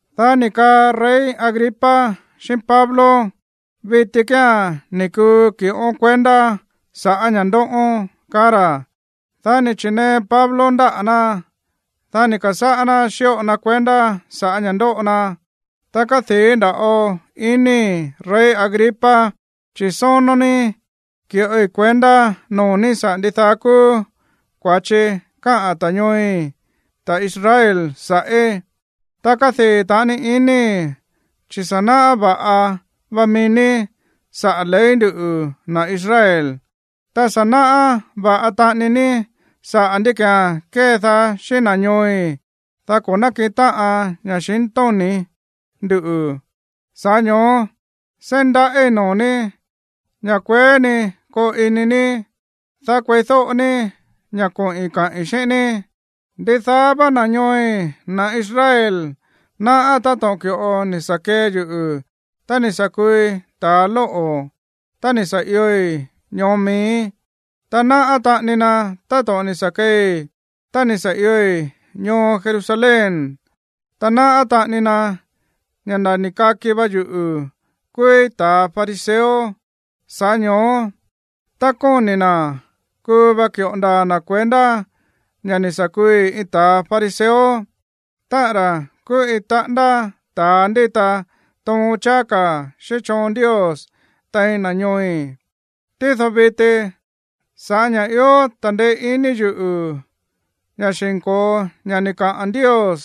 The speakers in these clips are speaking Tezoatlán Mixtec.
Dá ni̱ kaa rey Agripa xíꞌín Pablo: ―Viti kía̱n ní kuu ki̱ꞌón kuendá sa̱ꞌá ña̱ ndóꞌón ―kaá ra̱. Dá ni̱ chi̱nee Pablo ndáꞌa̱ ná, dá ni̱ ka̱sáꞌá ná xíꞌo na kuendá sa̱ꞌá ña̱ ndóꞌo na: ―Ta kádii̱ nda̱ꞌo inii̱, rey Agripa, chi̱ sónó ní ki̱ꞌoi kuendá noo̱ ní saꞌa̱ ndidaá kúú kua̱chi káꞌa̱n ta̱ ñooi̱, ta̱ Israel, sa̱ꞌí. Ta kádii̱ taꞌani inii̱, chi̱ sa̱ náꞌá va̱ꞌa va mií ní saꞌa̱ ley nduꞌu̱, na̱ Israel. Ta sa̱ náꞌá va̱ꞌa taꞌani ní saꞌa̱ ndí ki̱án kédaá xíꞌín na̱ ñooi̱, dá ko̱ nákiꞌin táꞌan ña̱xintóni̱ ndú. Sa̱ꞌá ño̱ó seí ndaꞌíi̱ noo̱ ní ña̱ kueé ni koo ini ní, dá kueídóꞌo ní ña̱ koꞌi̱n kaꞌi̱n xíꞌín ní. ’Ndidaá vá na̱ ñooi̱, na̱ Israel, náꞌá táto̱ꞌon ki̱ꞌo ni̱ sa̱ kee yuꞌu̱ tá ni̱ sa̱ kuui talóꞌo̱ tá ni̱ sa̱ ioi̱ ñoo miíí, ta náꞌá taꞌani na táto̱ꞌon ni̱ sa̱ keei tá ni̱ sa̱ ioi̱ ñoo Jerusalén. Ta náꞌá taꞌani na ña̱ nda̱ ni̱ kaki va yuꞌu̱ kúúí ta̱a fariseo. Sa̱ꞌá ño̱ó, tá kóni̱ na̱, kuu va ki̱ꞌo ndaa̱ na̱ kuendá ña̱ ni̱ sa̱ kuui iin ta̱a fariseo, táꞌa̱n ra̱ kúú iin taꞌándá ta̱a ndíta toon cháá ka̱ xíꞌín choon Ndios tein na̱ ñooi̱. Tído viti, sa̱ꞌá ña̱ ió ta̱ndeé iní yuꞌu̱ ña̱ xi̱nko̱o ña̱ ni̱ kaa Ndios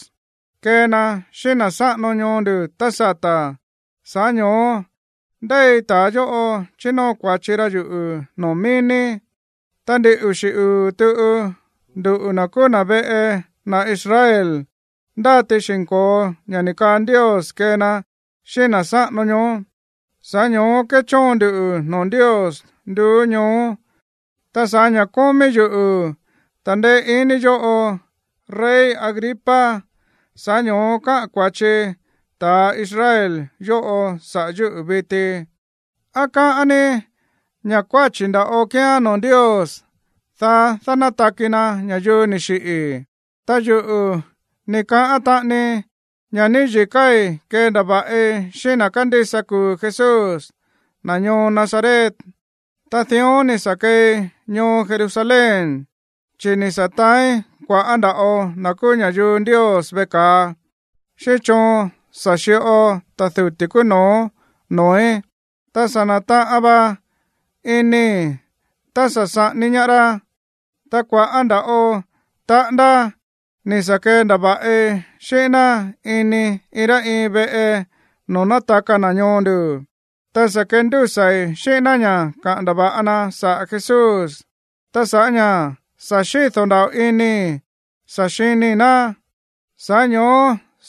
kee na xíꞌín na̱ sáꞌano ñoo ndu̱ tá sata̱, sa̱ꞌá ño̱ó ndéi ta̱a yóꞌo chínóo kua̱chi ra yuꞌu̱ noo̱ mií ní. Ta ndin uxi̱ uu̱ tuꞌu, nduꞌu̱ na̱ kúú na̱ veꞌe na̱ Israel, ndáti xi̱nko̱o ña̱ ni̱ kaa Ndios kee na xíꞌín na̱ sáꞌano ñoó. Sa̱ꞌá ño̱ó kéchóon ndu noo̱ Ndios nduú ñoó. Ta sa̱ꞌá ña̱ kómí yuꞌu̱ ta̱ndeé iní yóꞌo, rey Agripa, sa̱ꞌá ño̱ó káꞌa̱n kua̱chi ta̱ Israel yóꞌo sa̱ꞌá yuꞌu̱ viti. ¿Á káꞌán ní ña̱ kuáchi̱ nda̱ꞌo kíán noo̱ Ndios dánátaki na̱ ña̱yuu ni̱ xiꞌi̱? ’Ta yuꞌu̱ ni̱ kaꞌán taꞌanii ña̱ níyi̱káí kendava̱ꞌi xíꞌín na̱ kándísa kuu̱ Jesús, na̱ ñoo Nazaret. Ta dión ni̱ sa̱ keei ñoo Jerusalén, chi̱ ni̱ sa̱ taáín kua̱ꞌá nda̱ꞌo na̱ kúú ña̱yuu Ndios veꞌe ka̱a xíꞌín choon sa̱ xi̱ꞌo ta̱ duti̱ kúú no̱ó noo̱í. Ta sa̱ na̱taꞌan va inii̱ tá sa̱ saꞌání ñaá rá. Ta kua̱ꞌá nda̱ꞌo taꞌándá ni̱ sa̱ kendava̱ꞌi xíꞌín ná ini iin rá iin veꞌe noo̱ nátaka na̱ ñoo ndu̱, ta sa̱ kendúsa̱i̱ xíꞌín ná ña̱ kaꞌa̱n ndava̱ꞌa na saꞌa̱ Jesús. Ta sa̱ꞌá ña̱ sa̱ xído̱ nda̱ꞌo inii̱ sa̱ xinii̱ ná, sa̱ꞌá ño̱ó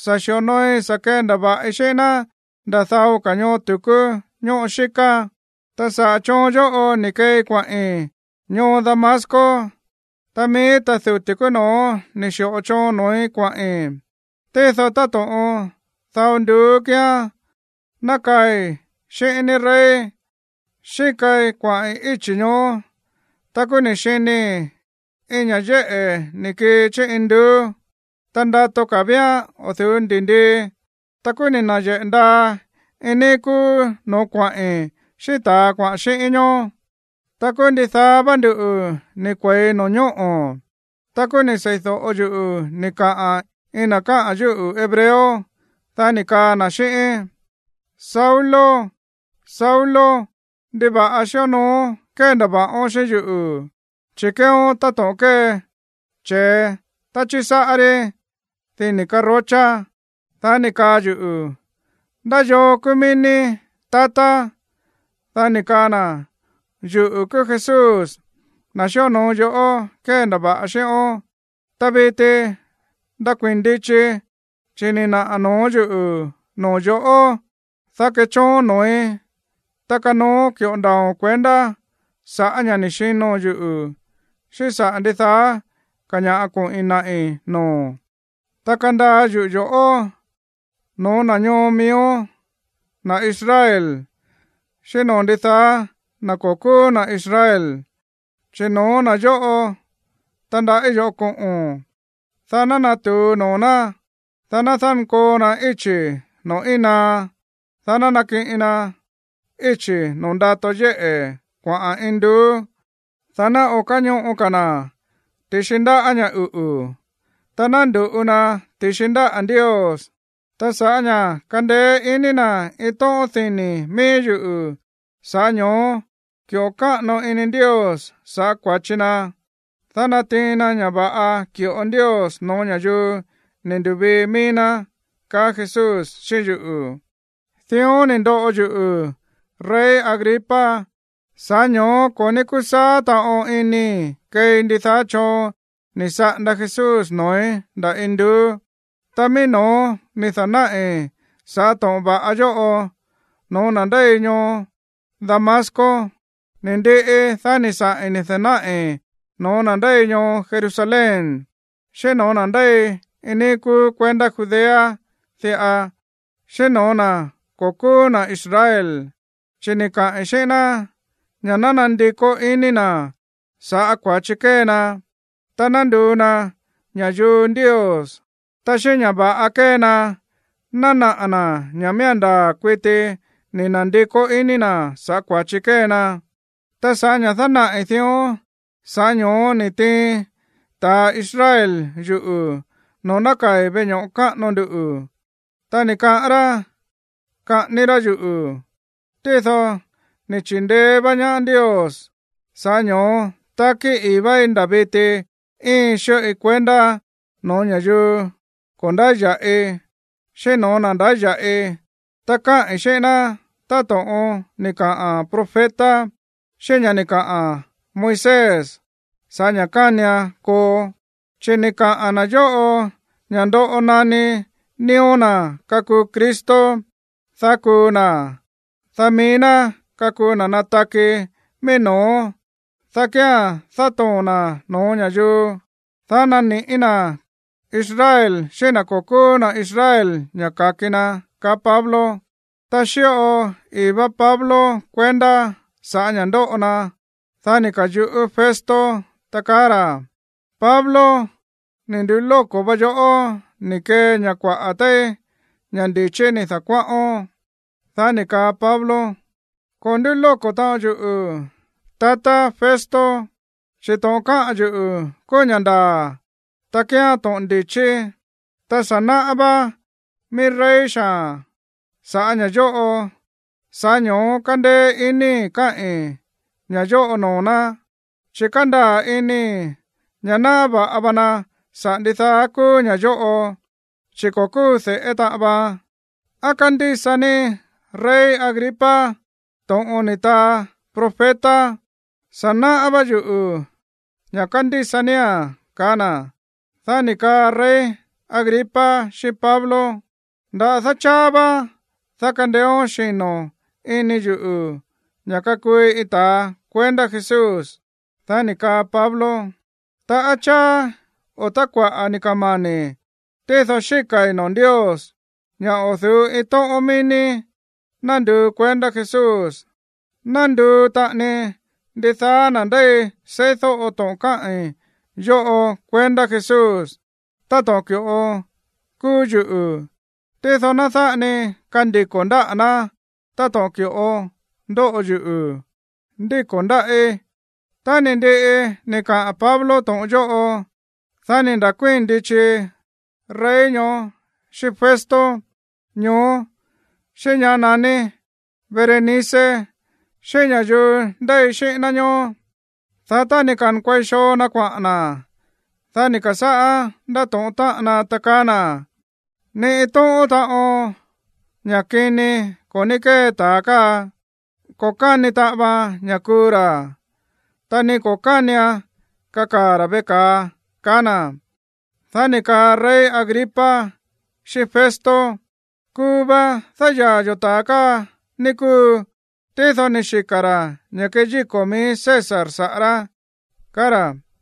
sa̱ xi̱onooi sa̱ kendava̱ꞌi xíꞌín ná nda̱ dao ka̱ ñoo tu̱kú ñóꞌo xíká. ’Ta saꞌa̱ choon yóꞌo ni̱ keei kuaꞌi̱n ñoo Damasco, ta mií ta̱ duti̱ kúú no̱ó ni̱ xi̱ꞌo choon noo̱í kuaꞌi̱n. Tído táto̱ꞌon dao nduú kíán, ná kaai̱ xíꞌín ní, rey, xíkai kuaꞌi̱n íchi̱ ñoó. Ta kúú ni̱ xinii̱ iin ña̱ yéꞌe̱ ni̱ kii chí induú. Ta ndato ka̱ víán o̱ du̱ú ndi̱ndii. Ta kúú ni̱ na̱yeꞌe̱ ndaa iin níí kúú no̱ó kuaꞌi̱n xíꞌín ta̱a kuaꞌa̱n xíꞌíín ñoó. Ta kúú ndidaá vá nduꞌu̱ ni̱ kue̱i no̱ñóꞌo̱. Ta kúú ni̱ sei̱do̱ꞌo yuꞌu̱ ni̱ kaꞌa̱n iin na̱ káꞌa̱n yúꞌu̱ hebreo, dá ni̱ kaa na̱ xíꞌíín: “Saulo, Saulo, ¿ndiva̱ꞌa xíonooón kéndava̱ꞌón xíꞌín yuꞌu̱? Chi̱ kéeón táto̱ꞌon kée che̱e tá chísáꞌá rí dini̱ karochá.” Dá ni̱ kaa yuꞌu̱: “¿Ndá yoo kúú mií ní, tatá?” Dá ni̱ kaa na̱: “Yuꞌu̱ kúú Jesús, na̱ xíonoo yoꞌó kéndava̱ꞌa xíꞌón. Ta viti ndakuii̱n ndichi, chi̱ ni̱ naꞌa̱ noo̱ yúꞌu̱ noo̱ yo̱ꞌó, dá kechóon noo̱í, ta kanooón ki̱ꞌo ndaa̱o̱n kuendá sa̱ꞌá ña̱ ni̱ xino̱n yuꞌu̱, xíꞌín saꞌa̱ ndidaá ka̱ ña̱ꞌa koꞌi̱n naꞌi̱ noo̱o̱n. Ta kandaa yuꞌu̱ yo̱ꞌó no̱ó na̱ ñoo miíón, na̱ Israel, xíꞌín noo̱ ndidaá na̱ ko̱ kúú na̱ Israel, chi̱ no̱ó na̱ yóꞌo tandaꞌí yo̱ꞌó koꞌo̱n, dá ná natu̱u noo̱ ná, dá ná dánkoo na íchi̱ noo̱ íin naá, dá ná nakiꞌin na íchi̱ noo̱ ndato yéꞌe̱ kuaꞌa̱n induú. Dá ná o̱ káñoꞌo ka̱ na̱ ti̱xi ndáꞌa̱ ña̱ uꞌu̱, ta ná ndu̱ꞌu na ti̱xi ndáꞌa̱ Ndios. Ta sa̱ꞌá ña̱ kandeé iní na̱ iin tóꞌón dini̱ mií yuꞌu̱, sa̱ꞌá ño̱ó ki̱ꞌo káꞌano ini Ndios sa̱ꞌá kua̱chi na, dá natiin na ña̱ va̱ꞌa ki̱ꞌo Ndios no̱ó ña̱yuu ni̱ ndu̱vii mií ná”, kaá Jesús xíꞌín yuꞌu̱. ’Dión ni̱ ndoꞌo yuꞌu̱, rey Agripa. Sa̱ꞌá ño̱ó ko̱ ní kúsaá taꞌon inii̱ keei ndidaá choon ni̱ saꞌanda Jesús noo̱í ndá induú. Ta mií no̱ó ni̱ da̱náꞌi̱ sa̱ꞌá to̱ꞌon va̱ꞌa yóꞌo no̱ó na̱ ndéi ñoo Damasco. Ni ndiꞌi, dá ni̱ saꞌi̱n ni̱ da̱náꞌi̱ no̱ó na̱ ndéi ñoo Jerusalén, xíꞌín no̱ó na̱ ndéi iin níí kúú kuendá Judea diꞌa, xíꞌín no̱ó na̱ ko̱ kúú na̱ Israel. Chi̱ ni̱ kaꞌi̱n xíꞌín ná ña̱ ná nandikó iní na̱ sa̱ꞌá kua̱chi kée na, ta ná nduu na ña̱yuu Ndios, ta xíꞌín ña̱ va̱ꞌa kée na ná naꞌa̱ na̱ ña̱ miía̱n ndaa̱ kuiti ni̱ na̱ndikó iní na̱ sa̱ꞌá kua̱chi kée na. Ta sa̱ꞌá ña̱ dánaꞌi̱ dión, sa̱ꞌá ño̱ó ni̱ tiin ta̱ Israel yuꞌu̱ noo̱ nákaa̱i̱ veꞌe ño̱ꞌo káꞌano ndu. Ta ni̱ kaꞌán rá kaꞌání rá yuꞌu̱. Tído ni̱ chi̱ndeé vá ñaá Ndios, sa̱ꞌá ño̱ó takí ii̱ váí nda̱ viti íin xíꞌoi kuendá no̱ó ña̱yuu ko̱ ndáya̱ꞌi, xíꞌín no̱ó na̱ ndáya̱ꞌi. Ta káꞌi̱n xíꞌín ná táto̱ꞌon ni̱ kaꞌa̱n profeta xíꞌín ña̱ ni̱ kaꞌa̱n Moisés sa̱ꞌá ña̱ kánian koo, chi̱ ni̱ kaꞌa̱n na̱ yóꞌo ña̱ ndoꞌo naní nío̱ na̱ kakuu Cristo, dá kuu na̱, dá mií ná kakuu na nataki mií no̱ó, dá kía̱n dátoo̱n na̱ no̱ó ña̱yuu, dá nani̱ꞌí na̱ Israel xíꞌín na̱ ko̱ kúú na̱ Israel ña̱ ka̱ki na ―kaá Pablo. Tá xíꞌo ii̱ vá Pablo kuendá sa̱ꞌá ña̱ ndóꞌo na, dá ni̱ ka̱yuꞌú Festo, ta kaá ra̱: ―¡Pablo, ni̱ ndulóko̱ va yoꞌó ni̱ kee ña̱ kuaꞌa̱ téí ña̱ ndi̱chí ni̱ da̱kuáꞌón! Dá ni̱ kaa Pablo: ―Ko̱ ndúlóko̱ taꞌon yuꞌu̱, tatá Festo, chi̱ to̱ꞌon káꞌa̱n yuꞌu̱ kúú ña̱ ndaa̱, ta kíán to̱ꞌon ndi̱chí. Ta sa̱ náꞌá vá mií rey xaa̱n sa̱ꞌá ña̱ yóꞌo. Sa̱ꞌá ño̱ó kándéé iníi̱ káꞌi̱n ña̱ yóꞌo noo̱ ná. Chi̱ kándaa̱ inii̱ ña̱ náꞌá va̱ꞌa va na saꞌa̱ ndidaá kúú ña̱ yóꞌo, chi̱ ko̱ kúu de̱ꞌé taꞌan vaan. ¿Á kándísa ní, rey Agripa, to̱ꞌon ni̱ taa profeta? Sa̱ náꞌá vá yuꞌu̱ ña̱ kándísa nía̱n ―kaá na̱. Dá ni̱ kaa rey Agripa xíꞌín Pablo: ―Nda̱dá cháá vá, dá kandeéón xino̱ ini yuꞌu̱ ña̱ kakuui iin ta̱ kuendá Jesús. Dá ni̱ kaa Pablo: ―Tá cháá o tá kuaꞌa̱ ni̱ kamani̱, tído xíka̱i̱ noo̱ Ndios ña̱ o̱ du̱ú iin tóꞌón mií ní ná nduu kuendá Jesús, ná nduu taꞌani ndidaá na̱ ndéi seídóꞌo to̱ꞌon káꞌi̱n yóꞌo kuendá Jesús, táto̱ꞌon ki̱ꞌo kúú yuꞌu̱. Tído ná dáꞌa ni kandiko̱ ndáꞌa̱ ná táto̱ꞌon ki̱ꞌo ndóꞌo yuꞌu̱ ndíko̱ ndáꞌí. Tá ni̱ ndiꞌi ni̱ kaꞌa̱n Pablo to̱ꞌon yóꞌo, dá ni̱ nda̱kuíi̱n ndichi rey ñoó xíꞌín Festo ñoó, xíꞌín ñá naní Berenice, xíꞌín ña̱yuu ndéi xíꞌín ná ñóó. Dá tá ni̱ ka̱nkuei xoo na̱ kuaꞌa̱n na̱, dá ni̱ ka̱sáꞌá ndátóꞌón táꞌan na, ta kaá na̱: ―Ni iin tóꞌón taꞌon ña̱ꞌa kini ko̱ ní kée ta̱a káa. Ko̱ káni taꞌan vaan ña̱ kuu ra̱, ta ni ko̱ kánian kakaa̱ ra̱ veꞌe ka̱a ―kaá na̱. Dá ni̱ kaa rey Agripa xíꞌín Festo: ―Kuu va dáyaa̱ yo̱ ta̱a káa, ní kúu. Tído ni̱ xika̱ ra̱ ña̱ keyíko̱ mií César saꞌa̱ rá ―kaá ra̱.